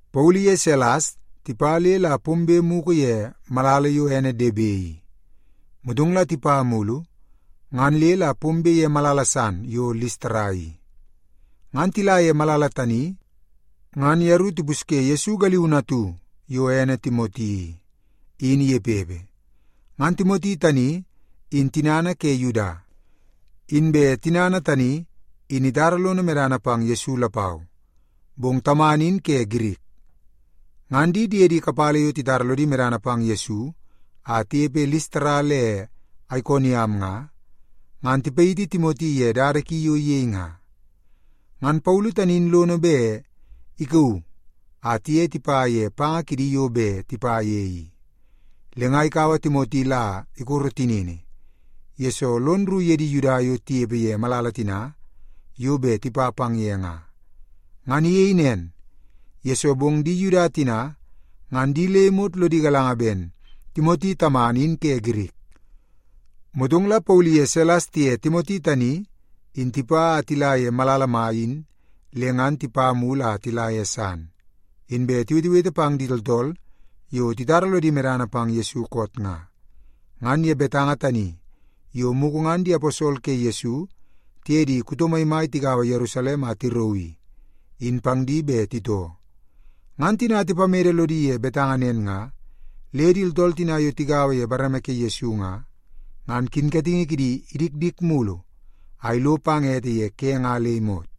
Paulu iye Silas tipa le la pombe mugu ye malala yo ene Debe i, motong la tipa mulu ngan le la pombe ye malala san yo Listara i. Ngan tila ye malala tani ngan yeru tipusye Yesu galiunu atu yo ene Timoti i, in inepepe. Ngan Timoti tani tinana in ke Yuda, inbe tinana tani in itara lono medana pang Yesu lapau, bong tamana in ke Girik. Ngan di diedi kapala yo titara lodi medana pang Yesu a tinepe Listara le Aikoniam nga, ngan tipayiti Timoti ye dada ki yo iyei nga. Ngan Paulu tani in lono bet ikauu a tiye tipa ye panga kidi yo bet tipa ye i. Le nga ikaua Timoti la ikoro tinini, yesoo lon rru ye di Yuda yo tinepe ye malala tina yo bet tipa pang ye nga. Ngan iyei nen, yesoo bong di Yuda tina ngan di le imot lodi galanga ben Timoti tamana in ke Girik. Motong la Paulu iye Silas tiye Timoti tani in tipa a tila ye malala mai in le ngan tipa mulu a tila ye san, inbe tiwetewete pang di tooltool yo titara lodi medana pang Yesu koot nga, ngan ye betanga tani yo mugu ngan di aposol ke Yesu, tiye di kuto maimai tigaua Yerusalem a tirauu i, in pang di bet titoo. Ngan tina tipamede lodi ye betanga nen nga, le di tooltool tina yo tigaua ye bareme ke Yesu nga, ngan kinkatingi kidi idikdik mulu a ilo pang ete ye ke nga le imot.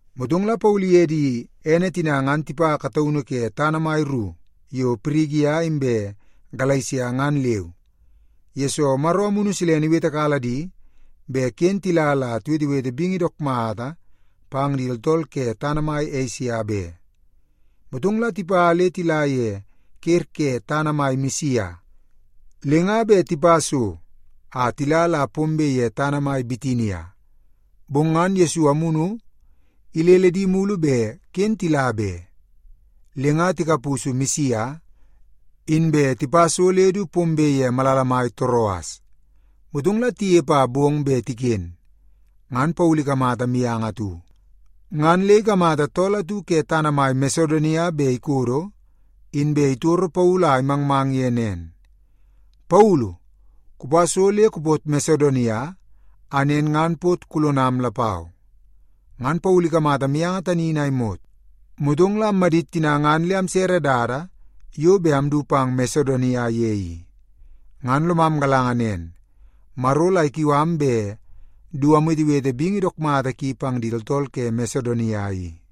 Motong la Paulu iye di diene tina ngan tipa kataunu ke tana mai ru yo Pirigia inbe Galesia ngan leu, yesoo Maro Amunu Silene iwetekala di bet ken tila la tiwetewete bingi dook mata pang di tooltool ke tana mai Esia be. Motong la tipa le tila ye ker ke tana mai Misia, le nga bet tipa so a tila la pombe ye tana mai Bitinia, bong ngan Yesu Amunu ilele di mulu bet ken tila be. Le nga tikapusu Misia, inbe tipa so le du pombe ye malala mai Toroas. Motong la tinepe a bong bet tiken, ngan Paulu ikamata mianga atu. Ngan le ikamata tool atu ke tana mai Masedonia bet ikodo, inbe itoru Paulu a imangmang ye nen, “Paulu, kupa so le kupot Masedonia, a nen ngan pot kulonam lapau!” Ngan Paulu ikamata mianga tani in a imot, motong la ammadit tina ngan le amsere dada yo bet amdu pang Masedonia ye i. Ngan lomam galanga nen, Maro la ikiu am bet du amwetewete bingi dook mata ki pang di tooltool ke Masedonia i.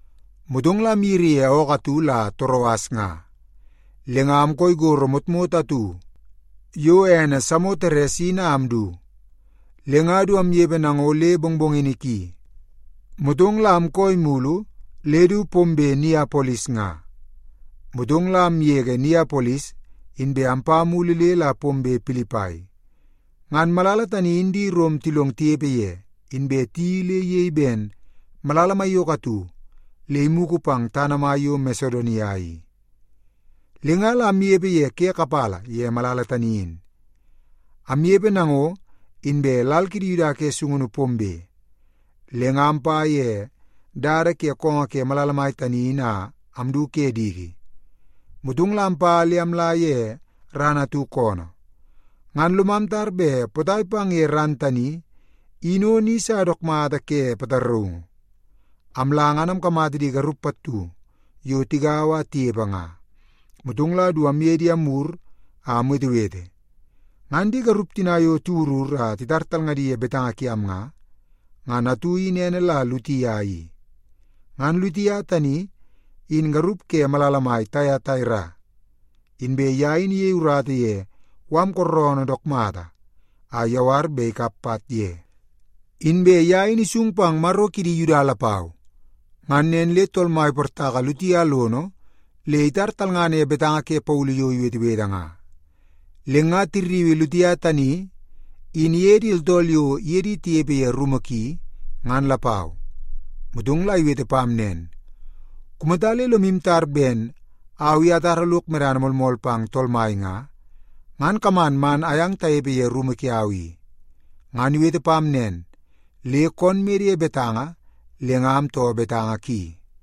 Motong la amyiri ye ookoo atu la Toroas nga, le nga amkooi gorro motmot atu yo ene Samoteres in a amdu. Le nga du amnepe nango le mongmongini ki, motong la amkooi mulu le du pombe Niapolis nga. Motong la amgege Niapolis, inbe ampa mulu le la pombe Pilipai. Ngan malala tani in di Rom tilong tinepe ye, inbe tiyeii le iyei ben malala maiyoko atu le imugu pang tana mai yo Masedonia i. Le nga la amnepe ye ke kapala ye malala tani in. Amnepe nango, inbe lal kidi Yuda ke sungunu pombe, le nga ampa ye dada ke koongoo ke malala mai tani in a amdu ke diki, motong la ampa le amla ye ran atu koonoo. Ngan lomam tar bet potai pang ye ran tani in o ni sa dook mata ke pataraungu. Amla ngan amkamata di garup pattu yo tigaua a tinepe nga. Motong la du amye di amwur a amwetewete. Ngan di garup tina yo tiwurur a titar talngadi ye betanga kiam nga, ngan atu in ene la Litia i. Ngan Litia tani in garup ke malala mai Taiataira, inbe ye in iyei urata ye mala kooroonoo dook mata a iyawar bet ikap pat ye. Inbe ye in isung pang Maro kidi Yuda lapau. Ngan nen le Tool Mai iportaka Litia lono le itar talngana ye betanga ke Paulu yo iwetewete nga. Le nga tirriui Litia tani in iye di tooltool yo iye di tinepe ye rumu ki, ngan lapau. Motong la iwete pam nen, “Kumata le lomu tar ben au i atara lok medana moolmool pang Tool Mai nga, ngan kaman man ayang tanepe ye rumu kiau i.” Ngan iwete pam nen le koon mede ye betanga le nga amtoo betanga ki.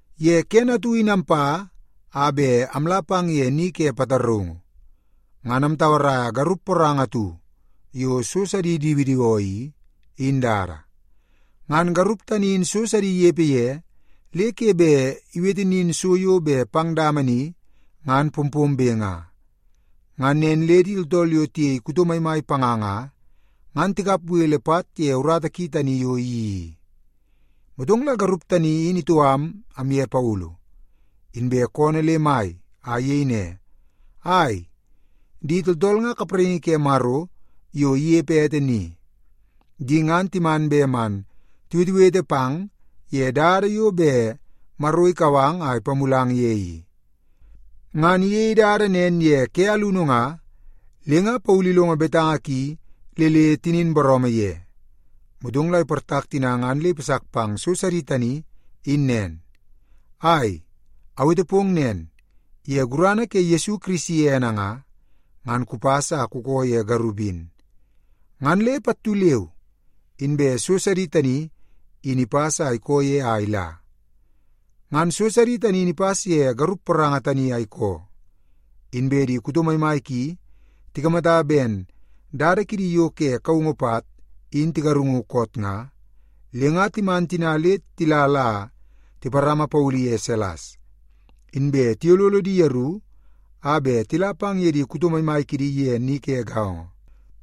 Ye kene atu in ampa a bet amla pang ye ni ke pataraungu, ngan amtauaraia garup poranga atu yo so sidi idiwidiwoo i, in dada. Ngan garup tani in so sidi inepe ye le ke bet iwete nin so yo bet pang dama ni ngan pompombe nga. Ngan nen le di tooltool yo tiyei kuto maimai panga nga, ngan tikap bele pat ye urata ki tani yo iyeii i. Motong la garup tani in itoo am amye Paulu, inbe koonoo le mai, a iyei ne, “Ai, di tooltool nga kapraingi ke Maro yo inepe ete ni! Di ngan timan bet man tiwetewete pang ye dada yo bet Maro ikau ang a ipamulang ye i!” Ngan iyei dada nen ye ke alunu nga, le nga Paulu ilongo betanga ki le le tinin booroomoo ye, motong la iportak tina ngan le ipasak pang so sidi tani in nen, “Ai, awete pong nen, ye gurana ke Yesu Kirisi ene nga, ngan kupas a kukoo ye garup in.” Ngan le pattu leu inbe so sidi tani in ipas a ikoo ye a ila. Ngan so sidi tani in ipas ye garup poranga tani a ikoo, inbe di kuto maimai ki tikamata ben dada kidi yo ke kaungu pat in tigarungu koot nga, le nga timan tina le tila la tiparama Paulu iye Silas, inbe tiyololo di yeru a bet tila pang ye di kuto maimai kidi ye ni ke gaongo.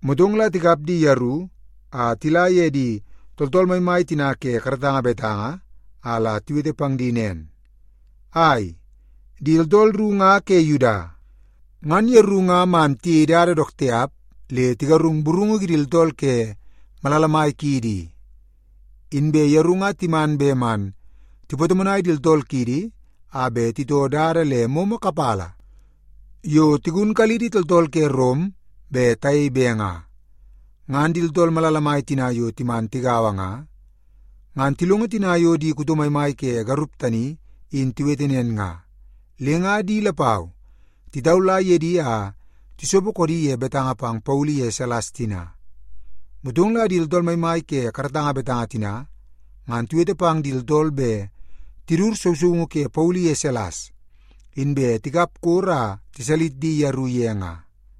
Motong la tikap di yeru a tila ye di tooltool maimai tina ke karatanga betanga a la tiwete pang di nen, “Ai, di tooltool ru nga ke Yuda, ngan yeru nga man tiyei dada dook tiap le tigarung burungu kidi tooltool ke malala mai kiidi i. Inbe yeru nga timan bet man tipatomonai di tooltool kiidi a bet titoo dada le momo kapala yo tigunkalidi tooltool ke Rom bet tayei be nga.” Ngan di tooltool malala mai tina yo timan tigaua nga, ngan tilongo tina yo di kuto maimai ke garup tani in tiwete nen nga, le nga di lapau titaula ye di a tisopo koodi ye betanga pang Paulu iye Silas tina. Motong la di tooltool maimai ke karatanga betanga tina ngan tiwete pang di tooltool bet tidut sousoungu ke Paulu iye Silas, inbe tikap koro a tiwalis di yeru ye nga.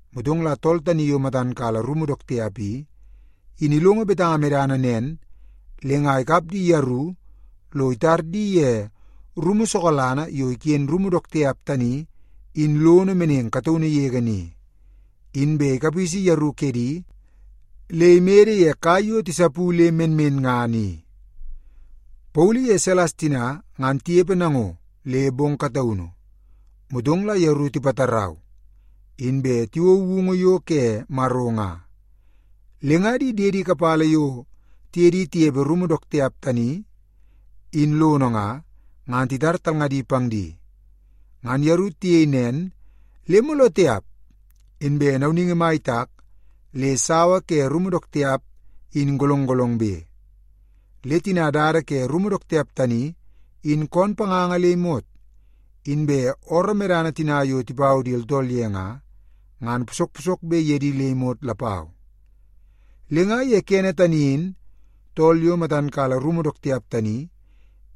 Motong la tool tani yo matan kala rumu dook tiap i, in ilongo betanga medana nen, le nga ikap di yeru lo itar di ye rumu sokalana yo iken rumu dook tiap tani in lono meneng kataunu yege ni. Inbe ikapisi yeru kedi le imede ye kai yo tisapu le menmenngana i. Paulu iye Silas tina ngan tinepe nango le bong kataunu, motong la yeru tipatarau, inbe tiwou woungu yo ke Maro nga. Le nga di diede kapala yo tiye di tinepe rumu dook tiap tani in lono nga, ngan titar talngadi pang di. Ngan yeru tiyei nen le mooloo tiap inbe nauningi mai itak le sawa ke rumu dook tiap in golong golongbe. Le tina dada ke rumu dook tiap tani in koon panganga le imot, inbe ooroo medana tina yo tipau di tooltool ye nga, ngan posok posokbe ye di le imot lapau. Le nga ye kene tani in tool yo matan kala rumu dook tiap tani,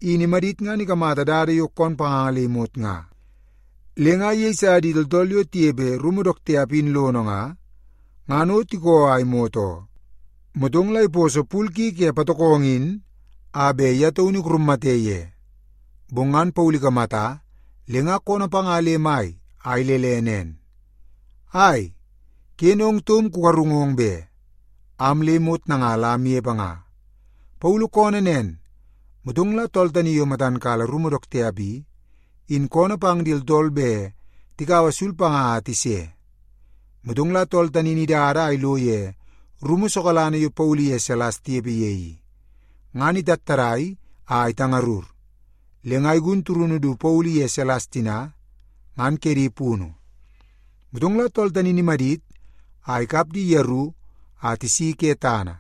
in imadit ngan ikamata dada yo koon panganga le imot nga, le nga iyeisa di tooltool yo tinepe rumu dook tiap in lono nga, ngan o tikoo a imot oo. Motong la iposo pul ki ke patokongo in a bet ye taunu ikurummate ye. Bong ngan Paulu ikamata, le nga koonoo panga le mai a ilele nen, “Ai, ken ong taum kugarungong be! Am le imot nanga la amnepe nga.” Paulu koonoo nen, motong la tool tani yo matan kala rumu dook tiap i, in koonoo pang di tooltool bet tikaua sul panga a tise. Motong la tool tani in idada a ilo ye rumu sokalana yo Paulu iye Silas tinepe ye i. Ngan itattadai a itangarur, le nga igun turunu du Paulu iye Silas tina, ngan kedi punu. Motong la tool tani in imadit a ikap di yeru a tisi ke tana,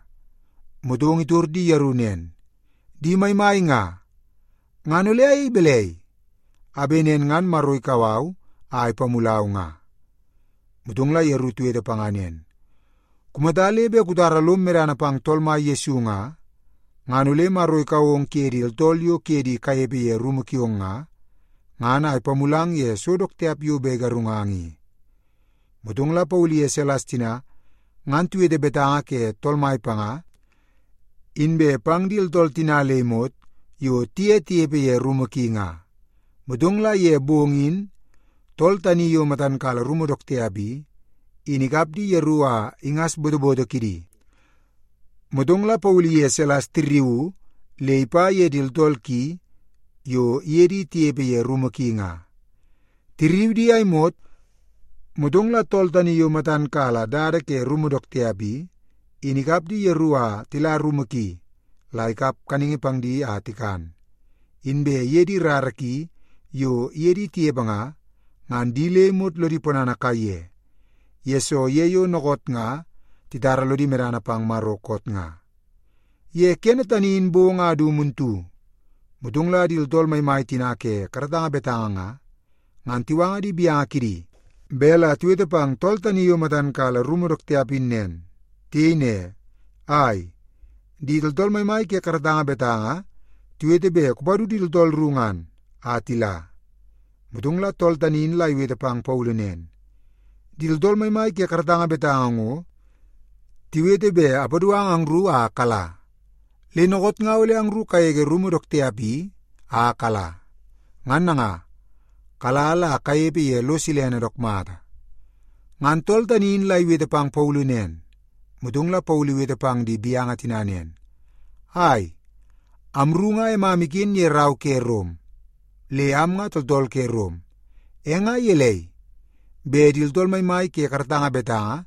motong la itor di yeru nen, “Di maimai nga, ngan ole ayei balai, a bet nen ngan Maro ikau au a ipamulau nga?” Motong la yeru tiwete panga nen, “Kumata le bet kutara lom medana pang Tool Mai Yesu nga, ngan ole Maro ikau ong kuye di tooltool yo kuye di kanepe ye rumu kiong nga, ngan a ipamulang ye so dook tiap yo bet igarungang i.” Motong la Paulu iye Silas tina ngan tiwete betanga ke Tool Mai panga inbe pang di tooltool tina le imot yo tiye tinepe ye rumu ki nga. Motong la ye bong in tool tani yo matan kala rumu dook tiap i, in ikap di yeru a ingas botoboto kidi. Motong la Paulu iye Silas tirriuu le ipa ye di tooltool ki yo iye di tinepe ye rumu ki nga. Tirriu di a imot, motong la tool tani yo matan kala dada ke rumu dook tiap i, in ikap di yeru a tila rumu ki la ikap kaningi pang di a tikan. Inbe iye di rara ki yo iye di tinepe nga, ngan di le imot lodi ponana kaiye, yesoo ye yo dookoot nga titara lodi medana pang Maro koot nga. Ye kene tani in bong a du muntu, motong la di tooltool maimai tina ke karatanga betanga nga, ngan tiwanga di gaunu kidi bet la tiwete pang tool tani yo matan kala rumu dook tiap in nen. Tiyei ne, “Ai, di tooltool maimai ke karatanga betanga tiwete bet kupadu di tooltool ru ngan, a tila.” Motong la tool tani in la iwete pang Paulu nen, “Di tooltool maimai ke karatanga betanga ngo tiwete bet apadu ang angru a kala. Le dookoot nga ole angru kagege rumu dook tiap i a kala. Ngan nanga, kala la kanepe ye lo silene dook mata.” Ngan tool tani in la iwete pang Paulu nen, motong la Paulu iwete pang di gaunu tina nen, “Ai, amru nga emam iken ye rau ke Rom, le am nga tooltool ke Rom. E nga gelei bet di tooltool maimai ke karatanga betanga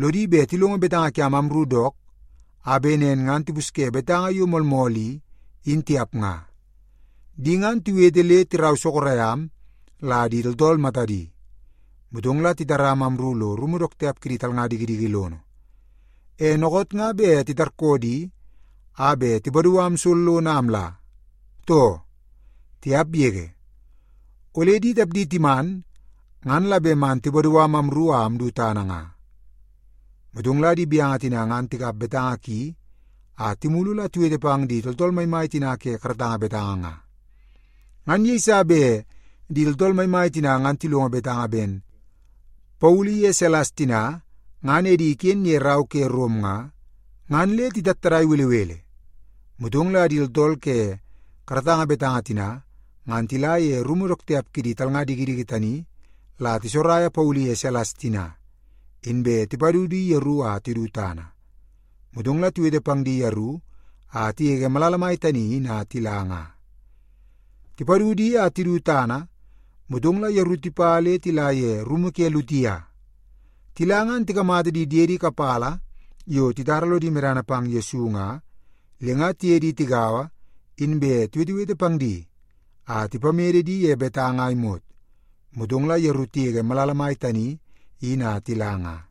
lodi bet tilongo betanga kiam amru dook a bet nen ngan tipusye betanga yo moolmool i, in tiap nga? Di ngan tiwete le tirau sorok am la di tooltool matadi, motong la titaram amru lo rumu dook tiap kidi talnga dikidiki lono. E dookoot nga bet titarkoo di a bet tipadu am sollono a amla, too? Tiap yege! Ole di tapdi timan, ngan la bet man tipadu am amru a amdu tana nga.” Motong la di gaunu tina ngan tikap betanga ki a timulu la tiwete pang di tooltool maimai tina ke karatanga betanga nga. Ngan yeiso bet di tooltool maimai tina ngan tilongo betanga ben Paulu iye Silas tina ngan edi iken ye rau ke Rom nga, ngan le titattadai belebele. Motong la di tooltool ke karatanga betanga tina ngan tila ye rumu dook tiap kidi talnga dikidiki tani la tisokoraia Paulu iye Silas tina, inbe tipadu di yeru a tidu tana. Motong la tiwete pang di yeru a tigege malala mai tani in a tila nga. Tipadu di a tidu tana, motong la yeru tipa le tila ye rumu ke Litia. Tila ngan tikamata di diedi kapala yo titara lodi medana pang Yesu nga, le nga tiye di tigaua inbe tiwetewete pang di a tipamede di ye betanga a imot, motong la yeru tigege malala mai tani in a tila nga.